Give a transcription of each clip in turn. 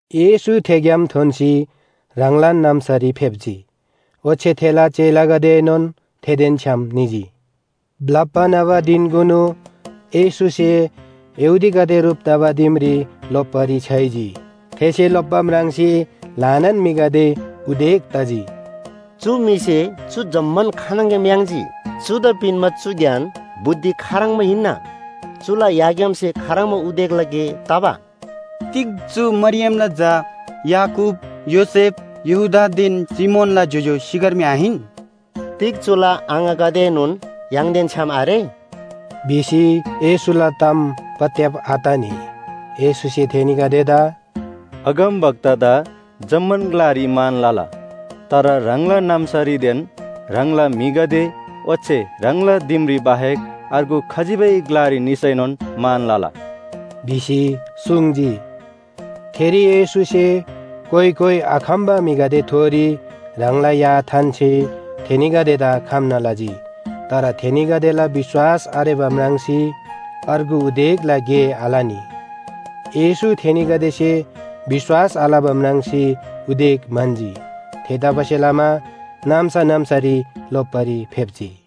येशू थे ग्‍याम थोन्‍सी ह्राङलान नाम्‍सारी फेप्‍जी। ओच्‍छे थेला चेलागदेएनोन थेदेन छ्‌याम निजी। ब्‍लप्‍बा न्‍हबा धिनकुनु येशूसे यहूदीगदे ह्रुप तबा दिमरी लोप्‍बारी छ्‌याइजी। थेसे लोप्‍बा म्राङ्सी ल्‍हानान म्‍हिगदे उदेक तजी, “चु म्‍हिसे चु जम्‍मान खानङग्‍याम याङ्जी? चुदा पिन्‍बा चु ज्ञान बुद्धि खाह्रङ्बा हिन्‍ना? चुला याग्‍यामसे खाह्रङ्बा उदेकला गे तबा? तिग चु मरियमला झा, याकूब, योसेफ, यहूदादेन सिमोनला ज्‍योज्‍यो सिकर्मी आहिन? तिग चुला आङागदेएनोन य्‍हाङदेन छ्‌याम आरे?” भिसी येशूला ताम पत्‍याब आतनी। येशूसे थेनीगदेदा “अगमवक्तादा जम्‍मान ग्‍लारी मान लला, तर ह्राङला नाम्‍सारीदेन ह्राङला म्‍हिगदे ओच्‍छे ह्राङला दिमरी बाहेक अर्गु खजिबै ग्‍लारी निसैनोन मान लला” भिसी सुङ्जी। थेरी येशूसे कोइ कोइ आखम्‍बा म्‍हिगदेथोरी ह्राङला या थान्‍सी थेनीगदेदा खम्‍ना लजी। तर थेनीगदेला विश्‍वास आरेबा म्राङ्सी अर्गु उदेकला गे आलनी। येशू थेनीगदेसे विश्‍वास आलबा म्राङ्सी उदेक म्‍हन्‍जी। थेतबासेलमा नाम्‍सा नाम्‍सारी लोप्‍बारी फेप्‍जी।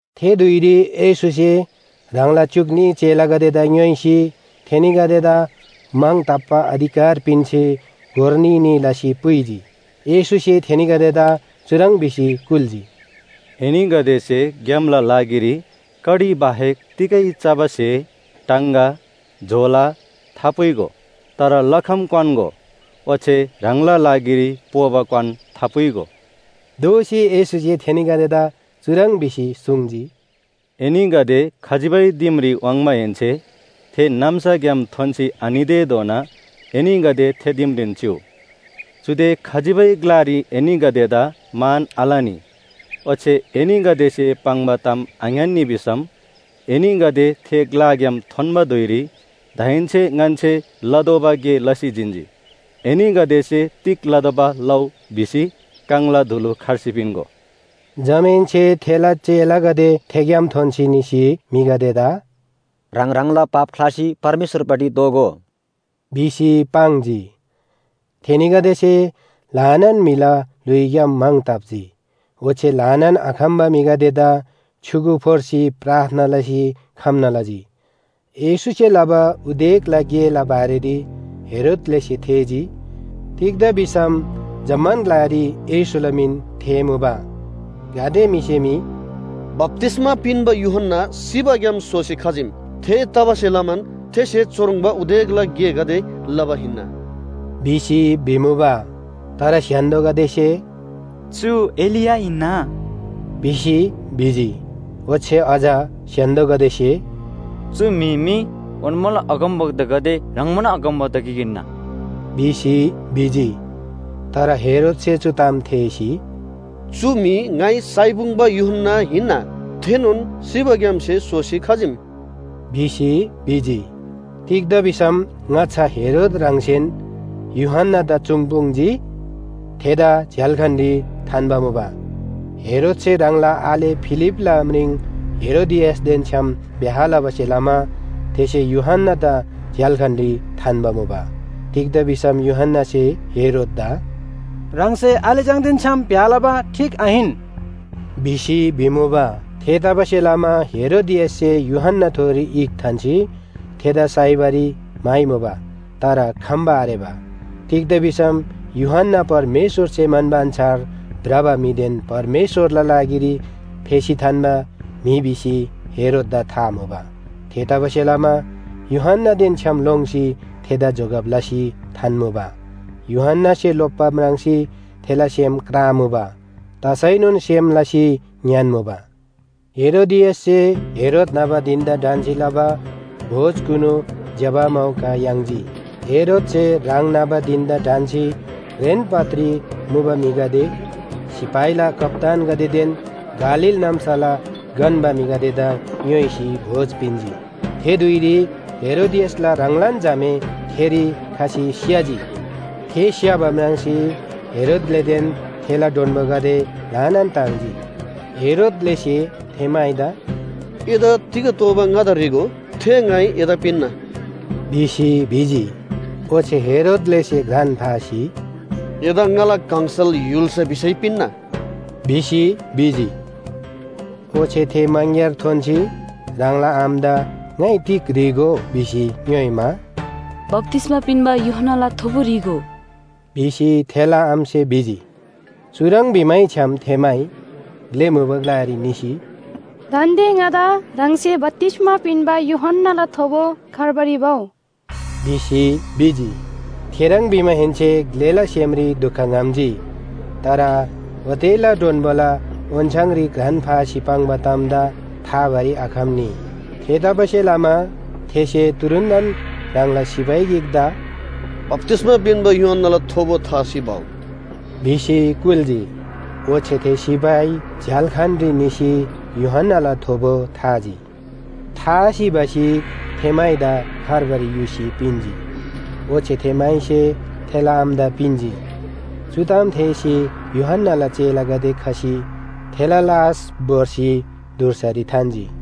थे धुइरी येशूसे ह्राङला च्‍युक न्‍ही चेलागदेदा ङ्‌योइसी थेनीगदेदा म्‍हङ ताप्‍बा अधिकार पिन्‍सी गोर न्‍ही न्‍ही लसी पुइजी। येशूसे थेनीगदेदा चुह्रङ् भिसी कुल्‍जी, “एनीगदेसे ग्‍यामला लागिरी कडी बाहेक तिगै चबा स्‍हे, टाङगा, झोला थापुइगो। तर लखम क्‍वान्‍गो, ओच्‍छे ह्राङला लागिरी पोबा क्‍वान थापुइगो। दोःसी येशूसे थेनीगदेदा चुह्रङ् भिसी सुङ्जी, “एनीगदे खजिबै दिमरी वाङ्माहेन्‍से थे नाम्‍साग्‍याम थोन्‍सी आनितेधोना एनीगदे थे दिमरीन चिउ। चुदे खजिबै ग्‍लारी एनीगदेदा मान आलनी। ओच्‍छे एनीगदेसे पाङ्बा ताम आङ्‌यान्‍नी भिसम, एनीगदे थे ग्‍लाग्‍याम थोन्‍बा धुइरी दाहेन्‍से ङन्‍से लतोःबा गे लसी जिन्‍जी। एनीगदेसे तिग लतोःबा लउ भिसी काङला धुलु खर्सी पिन्‍गो।” जमाहेन्‍से थेला चेलागदे थेग्‍याम थोन्‍सी निसी म्‍हिगदेदा “ह्राङ ह्राङला पाप ख्‍लासी परमेश्‍वरपट्टि दोःगो” भिसी पाङ्जी। थेनीगदेसे ल्‍हानान म्‍हिला ल्‍हुइग्‍याम म्‍हङ ताप्‍जी। ओच्‍छे ल्‍हानान आखम्‍बा म्‍हिगदेदा छ्‌युगु फोर्सी प्रार्थना लसी खम्‍ना लजी। येशूसे लबा उदेकला गेला बारेरी हेरोद ग्‍लेसे थेःजी, तिग्‍दा भिसम जम्‍मान ग्‍लारी येशूला मिन थेःमुबा। गाते म्‍हिसे मी “बप्‍तिस्‍मा पिन्‍बा यूहन्‍ना सिबाग्‍याम सोसी खजीम, थेतबासेलमान थेसे चुह्रङ्बा उदेकला गेगदे लबा हिन्‍ना” भिसी भिमुबा। तर स्‍य्‍हान्‍दोगदेसे, “चु एलिया हिन्‍ना” भिसी भिजी। ओच्‍छे अझ स्‍य्‍हान्‍दोगदेसे, “चु म्‍हि मी ओन्‍माला अगमवक्तागदे ह्रङ्‌बान अगमवक्ता गिक हिन्‍ना” भिसी भिजी। तर हेरोदसे चु ताम थेःसी, “चु म्‍हि ङाइ साइपुङ्‌बा यूहन्‍ना हिन्‍ना, थेनोन सिबाग्‍यामसे सोसी खजीम” भिसी भिजी। तिग्‍दा भिसम ङाच्‍छा हेरोद ह्राङसेन यूहन्‍नादा चुङ्‌पुङ्‌जी थेदा झ्‍याल्‍खानरी थान्‍बा मुबा। हेरोदसे ह्राङला आले फिलिपला म्रिङ हेरोदियासदेन छ्‌याम ब्‍याह लबासे लमा थेसे यूहन्‍नादा झ्‍याल्‍खानरी थान्‍बा मुबा। तिग्‍दा भिसम यूहन्‍नासे हेरोददा “ह्राङसे आले चाङदेन छ्‌याम ब्‍याह लबा ठीक आहिन” भिसी भिमुबा। थेतबासेलमा हेरोदियाससे यूहन्‍नाथोरी ईख थान्‍सी थेदा साइबारी म्‍हाइमुबा तर खम्‍बा आरेबा। तिग्‍दा भिसम यूहन्‍ना परमेश्‍वरसे म्‍हन्‍बा अन्‍छार भ्रबा म्‍हिदेन परमेश्‍वरला लागिरी फेसी थान्‍बा म्‍हि भिसी हेरोददा था मुबा। थेतबासेलमा यूहन्‍नादेन छ्‌याम लोङ्सी थेदा जोगब लसी थान्‍मुबा। यूहन्‍नासे लोप्‍बा म्राङ्सी थेला सेम क्रामुबा। तसैनोन सेम लसी ङ्‌यान्‍मुबा। हेरोदियाससे हेरोद न्‍हबा धिन‍दा ढन्‍सी लबा भोजकुनु ज्‍यबा मौका याङ्जी। हेरोदसे ह्राङ न्‍हबा धिन‍दा ढन्‍सी घ्रेन पदरी मुबा म्‍हिगदे, सिपाहीला कप्‍तानगदेदेन गालील नाम्‍साला गन्‍बा म्‍हिगदेदा ङ्‌योइसी भोज पिन्‍जी। थे धुइरी हेरोदियासला ह्राङलान झामे थेरी खसी स्‍य्‍हजी। थे स्‍य्‍हबा म्राङ्सी हेरोद ग्‍लेदेन थेला डोन्‍बोगदे ल्‍हानान ताङ्जी। हेरोद ग्‍लेसे थे माइदा “एदा तिग तोःबा ङादा ह्री‍गो, थे ङाइ एदा पिन्‍ना” भिसी भिजी। ओच्‍छे हेरोद ग्‍लेसे घ्रान फासी, “एदा ङाला गङसल य्‍हुल्‍सा भिसै पिन्‍ना” भिसी भिजी। ओच्‍छे थे मङग्‍यार थोन्‍सी ह्राङला आमादा ङाइ तिग ह्री‍गो भिसी, ङ्‌योइमा, “बप्‍तिस्‍मा पिन्‍बा यूहन्‍नाला थोबो ह्री‍गो” भिसी थेला आमासे भिजी। चुह्रङ् भिमैछ्‌याम थे माइ ग्‍ले मुबा ग्‍लारी निसी, “दान्‍दे ङादा ह्राङसे बप्‍तिस्‍मा पिन्‍बा यूहन्‍नाला थोबो खार्बारी भउ” भिसी भिजी। थेह्रङ् भिमाहेन्‍से ग्‍लेला सेमरी दुख ङ्‌हम्‍जी, तर ओतेला डोन्‍बोला ओन्‍छाङरी घ्रान फासी पाङ्बा तामदा थाबारी आखम्‍नी। थेतबासेलमा थेसे तुरुन्‍तन ह्राङला सिपाही गिकदा “बप्‍तिस्‍मा पिन्‍बा यूहन्‍नाला थोबो थासी भउ” भिसी कुल्‍जी। ओच्‍छे थे सिपाही झ्‍याल्‍खानरी निसी यूहन्‍नाला थोबो थाजी। थासी भसी थे माइदा खार्बारी युसी पिन्‍जी। ओच्‍छे थे माइसे थेला आमादा पिन्‍जी। चु ताम थेःसी यूहन्‍नाला चेलागदे खसी थेला लास भोर्सी धुर्सारी थान्‍जी।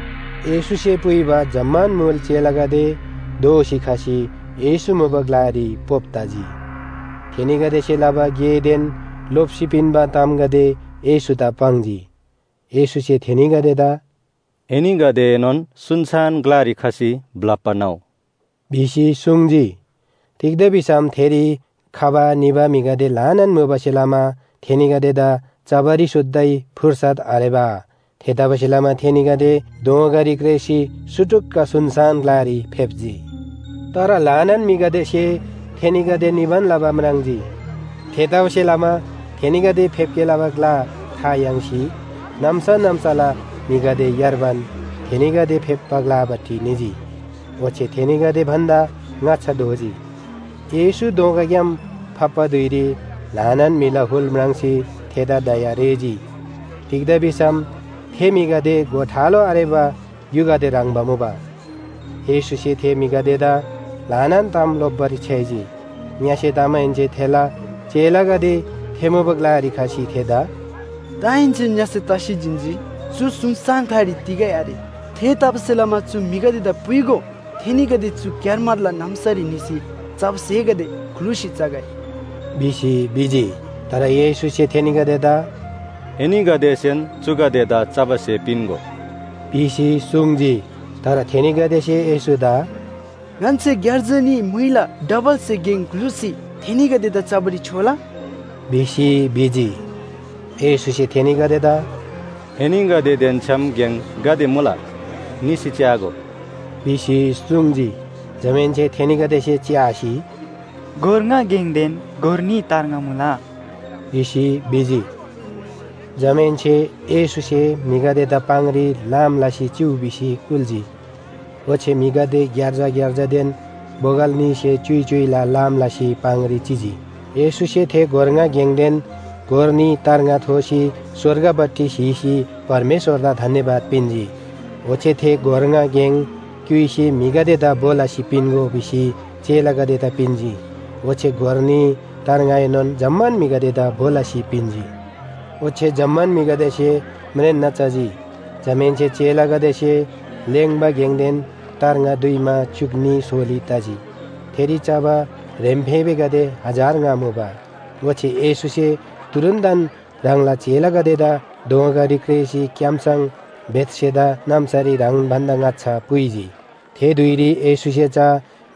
येशूसे पुइबा जम्‍मान मुल चेलागदे दोःसी खसी येशू मुबा ग्‍लारी पोप तजी। थेनीगदेसे लबा गेदेन लोप्‍सी पिन्‍बा तामगदे येशूदा पाङ्जी। येशूसे थेनीगदेदा “एनीगदेएनोन सुनसान ग्‍लारी खसी ब्‍लप्‍बा न्‍हउ” भिसी सुङ्जी। तिग्‍दा भिसम थेरी खबा निबा म्‍हिगदे ल्‍हानान मुबासे लमा थेनीगदेदा चबारी सुत्तै फुर्सत आरेबा। थेतबासेलमा थेनीगदे दोँगारी क्रेःसी सुटुक्‍क सुनसान ग्‍लारी फेप्‍जी। तर ल्‍हानान म्‍हिगदेसे थेनीगदे निबान लबा म्राङ्जी। थेतबासेलमा थेनीगदे फेप्‍गे लबा ग्‍ला था याङ्सी, नाम्‍सा नाम्‍साला म्‍हिगदे यार्बान थेनीगदे फेप्‍बा ग्‍लापट्टि निजी। ओच्‍छे थेनीगदे भन्‍दा ङाच्‍छा धोजी। येशू दोँगाग्‍याम फाप्‍बा धुइरी ल्‍हानान म्‍हिला हुल म्राङ्सी थेदा दया रेःजी। तिग्‍दा भिसम थे म्‍हिगदे गोठालो आरेबा ग्‍युगदे ह्रङ्‌बा मुबा। येशूसे थे म्‍हिगदेदा ल्‍हानान ताम लोप्‍बारी छ्‌याइजी। ङ्‍यसे तमाहेन्‍से थेला चेलागदे थे मुबा ग्‍लारी खसी थेदा “दाहेन्‍से ङ्‍यसे तसी जिन्‍जी, चु सुनसान ग्‍लारी तिगै आरे। थेतबासेलमा चु म्‍हिगदेदा पुइगो। थेनीगदे चु क्‍यारमारला नाम्‍सारी निसी चबा स्‍हेगदे ग्‍लुसी चगै” भिसी भिजी। तर येशूसे थेनीगदेदा “एनीगदेसेन चुगदेदा चबा स्‍हे पिन्‍गो” भिसी सुङ्जी। तर थेनीगदेसे येशूदा “ङन्‍से ग्‍यार्जा न्‍ही म्‍हुइला डबलसे गेङ ग्‍लुसी थेनीगदेदा चबारी छ्‍योला?” भिसी भिजी। येशूसे थेनीगदेदा “एनीगदेदेन छ्‌याम गेङ गाते मुला? निसी च्‍यागो” भिसी सुङ्जी। जमाहेन्‍से थेनीगदेसे च्‍यासी, “गोर ङा गेङदेन गोर न्‍ही तार्ङा मुला” भिसी भिजी। जमाहेन्‍से येशूसे म्‍हिगदेदा पाङरी लाम लसी चिउ भिसी कुल्‍जी। ओच्‍छे म्‍हिगदे ग्‍यार्जा ग्‍यार्जादेन बोगल न्‍हीसे च्‍युइ च्‍युइला लाम लसी पाङरी चिजी। येशूसे थे गोर ङा गेङदेन गोर न्‍ही तार्ङा थोसी स्‍वर्गपट्टि स्‍हीसी परमेश्‍वरदा धन्‍यवाद पिन्‍जी। ओच्‍छे थे गोर ङा गेङ क्‍युइसी म्‍हिगदेदा भो लसी पिन्‍गो भिसी चेलागदेदा पिन्‍जी। ओच्‍छे गोर न्‍ही तार्ङाएनोन जम्‍मान म्‍हिगदेदा भो लसी पिन्‍जी। ओच्‍छे जम्‍मान म्‍हिगदेसे म्रेन्‍ना चजी। जमाहेन्‍से चेलागदेसे लेङ्बा गेङदेन तार्ङा दुइमा च्‍युक न्‍ही सोली तजी। थेरी चबा ह्रेम्‍फेबेगदे हजार ङा मुबा। ओच्‍छे येशूसे तुरुन्‍तन ह्राङला चेलागदेदा दोँगारी क्रेःसी क्‍यामसङ बेथसेदा नाम्‍सारी ह्राङ भन्‍दा ङाच्‍छा पुइजी। थे धुइरी येशूसे चा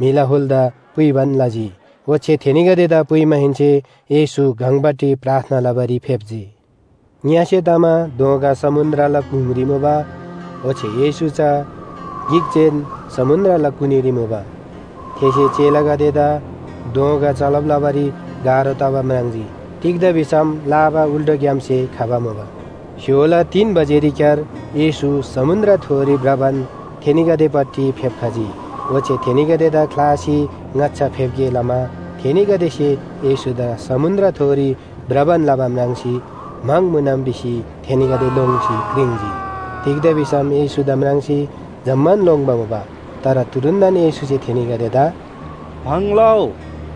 म्‍हिला हुलदा पुइबान लजी। ओच्‍छे थेनीगदेदा पुइमाहेन्‍से येशू गङपट्टि प्रार्थना लबारी फेप्‍जी। ङ्‍यसे तमा दोँगा समुन्‍द्रला गुङरी मुबा, ओच्‍छे येशू चा गिकजेन समुन्‍द्रला कुनीरी मुबा। थेसे चेलागदेदा दोँगा चलब लबारी गाह्रो तबा म्राङ्जी। तिग्‍दा भिसम लाबा उल्‍टोग्‍यामसे खबा मुबा। स्‍य्‍होला तीन बजेरीक्‍यार येशू समुन्‍द्रथोरी भ्रबान थेनीगदेपट्टि फेप्‍खजी, ओच्‍छे थेनीगदेदा ख्‍लासी ङाच्‍छा फेप्‍गे लमा, थेनीगदेसे येशूदा समुन्‍द्रथोरी भ्रबान लबा म्राङ्सी म्‍हङ मुनम भिसी थेनीगदे लोङ्सी क्रिङ्‌जी। तिग्‍दा भिसम येशूदा म्राङ्सी जम्‍मान लोङ्‌बा मुबा। तर तुरुन्‍तन येशूसे थेनीगदेदा “भङ लउ,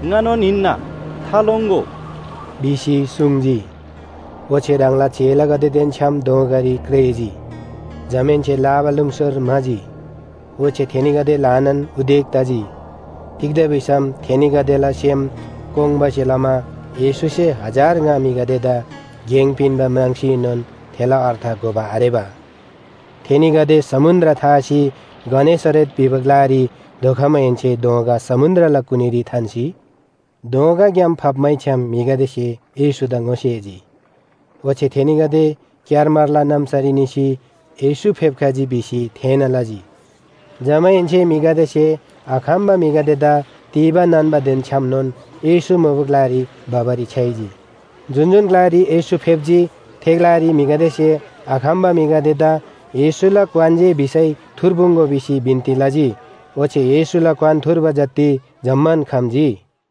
ङानोन हिन्‍ना, थालोङ्‍गो” भिसी सुङ्जी। ओच्‍छे ह्राङला चेलागदेदेन छ्‌याम दोँगारी क्रेःजी। जमाहेन्‍से लाबालुङसर म्‍हाजी। ओच्‍छे थेनीगदे ल्‍हानान उदेक तजी। तिग्‍दा भिसम थेनीगदेला सेम कोङ्बासे लमा येशूसे हजार ङा म्‍हिगदेदा गेङ पिन्‍बा म्राङ्सीएनोन थेला अर्थ घोबा आरेबा। थेनीगदे समुन्‍द्र थासी गनेसरेत भिबा ग्‍लारी धोखमाहेन्‍से दोँगा समुन्‍द्रला कुनीरी थान्‍सी, दोँगाग्‍याम फाप्‍मैछ्‌याम म्‍हिगदेसे येशूदा ङोसेजी। ओच्‍छे थेनीगदे क्‍यारमारला नाम्‍सारी निसी येशू फेप्‍खजी भिसी थेःना लजी। जमाहेन्‍से म्‍हिगदेसे आखम्‍बा म्‍हिगदेदा तीबा नान्‍बादेन छ्‌यामनोन येशू मुबा ग्‍लारी भबारी छ्‌याइजी। जुन जुन ग्‍लारी येशू फेप्‍जी, थे ग्‍लारी म्‍हिगदेसे आखम्‍बा म्‍हिगदेदा येशूला क्‍वान जे भिसै, थुर्पुङ्‍गो भिसी बिन्‍ती लजी। ओच्‍छे येशूला क्‍वान थुर्बा जति जम्‍मान खम्‍जी।